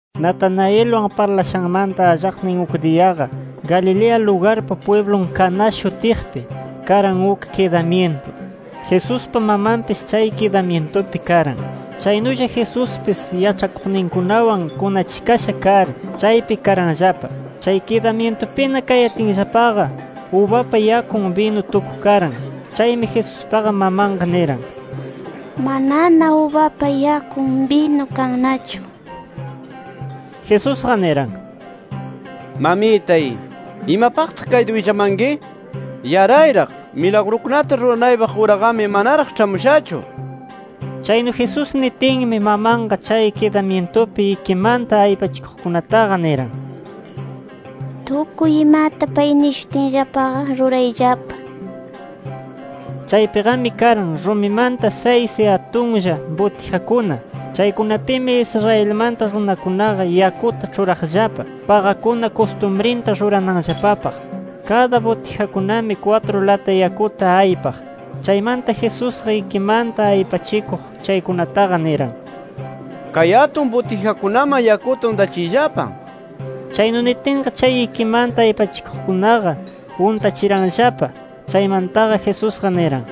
Natanaelwan parlashanmanta allaqnin uk diyaqa, Galilea lugarpa pwiblun Caná shutiqpi, karan uk kidamyintu. Jesuspa mamanpis chay kidamyintupi karan. Chaynulla Jesuspis yaĉhakuqninkunawan kunachikasha kar, chaypi karanllapa. Chay kidamyintupina kayatinllapaqa, ubapa yakun binu tukukaran. Chaymi Jesustaqa, mamanqa niran: —Manana ubapa yakun binu kannachu nir. Jesusqa niran: —Mamitay, ¿imapaqtaq kayta willamanki? ¡Yarayraq! Milagrukunata ruranaypaq uraqami, manaraq ĉhamushachu nir. Chaynu Jesús nitinmi, mamanqa chay kidamyintupi ikimanta aypachikuqkunataqa niran: —Tukuy imata pay nishutinllapaqa, rurayllapa nir. Chaypiqami karan, rumimanta saysi atunlla butijakuna. Chaykunapimi Israelmanta runakunaqa yakuta ĉhuraqllapa, paqakuna kustumrinta rurananllapapaq. Kada butijakunami kwatru lata yakuta aypaq. Chaymanta Jesusqa ikimanta aypachikuq chaykunataqa niran: —Kay atun butijakunaman yakuta untachiyllapa, nir. Chaynu nitinqa, chay ikimanta aypachikuqkunaqa, untachiranllapa. Chaymantaqa, Jesusqa niran: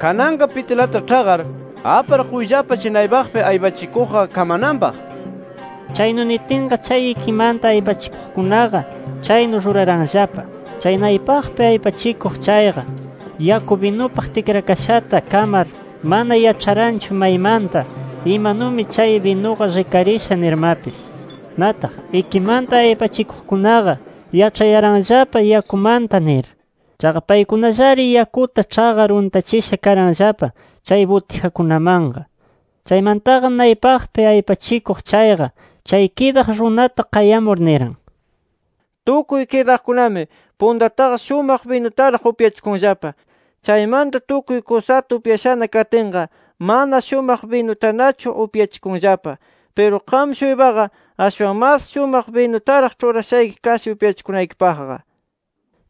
—Kananqa pitilata ĉhaqar, apar quyllapa chay naypaqpi aypachikuqqa kamananpaq nir. Chaynu nitinqa, chay ikimanta aypachikuqkunaqa, chaynu ruraranllapa. Chay naypaqpi aypachikuq chayqa yaku, binupaq tikrakashata kamar mana yaĉharanchu maymanta, imanumi chay binuqa rikarisha nirmapis. Nataq, ikimanta aypachikuqkunaqa, yaĉhayaranllapa yakumanta nir. Chaqa paykunallari yakuta ĉhaqar untachisha karanllapa chay butijakunamanqa. Chaymantaqa naypaqpi aypachikuq chayqa, chay kidaq runata qayamur, niran: —Tukuy kidaqkunami puntataqa shumaq binutaraq upyachikunllapa. Chaymanta tukuy kusata upyashana katinqa, mana shumaq binutanachu upyachikunllapa. Piru qam-shuypaqa ashwan mas shumaq binutaraq ĉhurashayki kasha upyachikunaykipaqqa nir.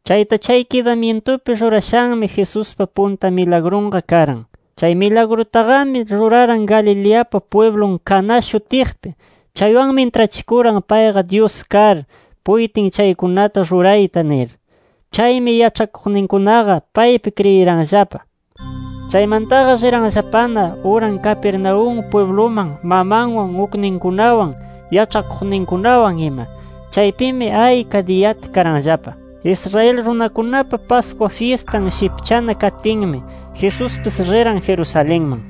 Chayta chay kidamyintupi rurashanmi, Jesuspa punta milagrunqa karan. Chay milagrutaqami ruraran Galileapa pwiblun Caná shutiqpi. Chaywanmi intrachikuran payqa Dyus kar, puytin chaykunata rurayta nir. Chaymi yaĉhakuqninkunaqa paypi kriyiranllapa. Chaymantaqa riranllapana uran Capernaúm pwibluman mamanwan, ukninkunawan, yaĉhakuqninkunawan ima. Chaypimi ayka diyata karanllapa. Israel runakunapa Pascua fyistan shipchana katinmi, Jesuspis riran Jerusalenman.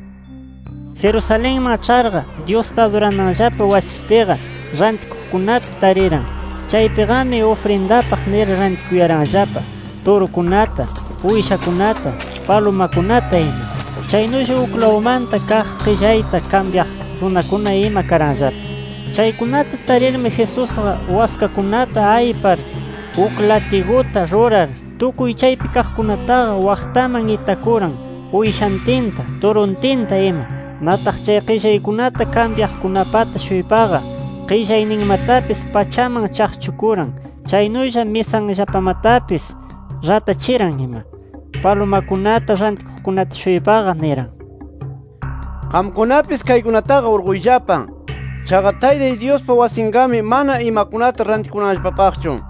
Jerusalenman ĉharqa, Dyusta adurananllapa wasipiqa, rantikuqkunata tariran. Chaypiqami ufrindapaq nir rantikuyaranllapa turukunata, uyshakunata, palumakunata ima. Chaynulla uklawmanta kaq qillayta kambyaq runakuna ima karanllapa. Chaykunata tarirmi, Jesusqa waskakunata aypar uk latiguta rurar, tukuy chaypi kaqkunataqa waqtaman itakuran, uyshantinta, turuntinta ima. Nataq chay qillaykunata kambyaqkunapata-shuypaqa, qillayninmatapis pachaman chaqchukuran. Chaynulla misanllapamatapis ratachiran ima. Palumakunata rantikuqkunata-shuypaqa niran: —¡Qamkunapis, kaykunataqa urquyllapa! ¡Chaqa Taytay Dyuspa wasinqami mana imakunata rantikunanllapapaqchu!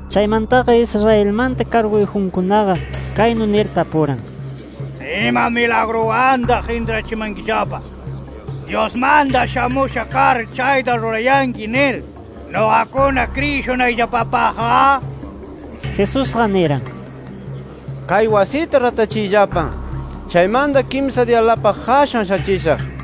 Chaymantaqa, Israelmanta karguyjunkunaqa, kaynu nir tapuran: —¿Ima milagruwantaq intrachimankillapa, Dyusmanta shamusha kar chayta rurayanki nir, nuqakuna kriyishunayllapapaqqa? Jesusqa niran: —Kay wasita ratachiyllapa. Chaymanta kimsa diyalapaq qashan shachishaq nir.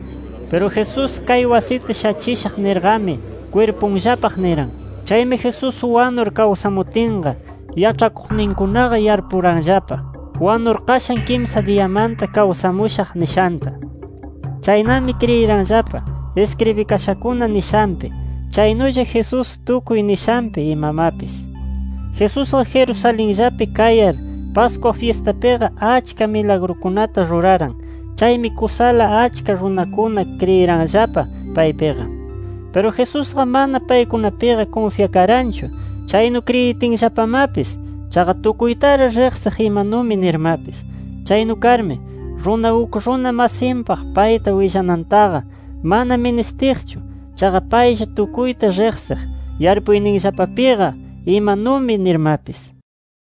Piru Jesús “Kay wasita shachishaq” nirqami, kwirpunllapaq niran. Chaymi Jesús wanur kawsamutinqa, yaĉhakuqninkunaqa yarpuranllapa, wanur qashan kimsa diyamanta kawsamushaq nishanta. Chaynami kriyiranllapa, iskribikashakuna nishanpi, chaynulla Jesús tukuy nishanpi imamapis. Jesusqa Jerusalenllapi kayar Pascua fyistapiqa achka milagrukunata ruraran. Chaymi kusala achka runakuna kriyiranllapa paypiqa. Piru Jesusqa mana paykunapiqa kunfyakaranchu, chaynu kriyitinllapamapis. Chaqa tukuytari riqsiq imanumi nirmapis. Chaynu karmi, runa uk runa masinpaq payta willanantaqa mana ministiqchu. Chaqa paylla tukuyta riqsiq, yarpuyninllapapiqa imanumi nirmapis.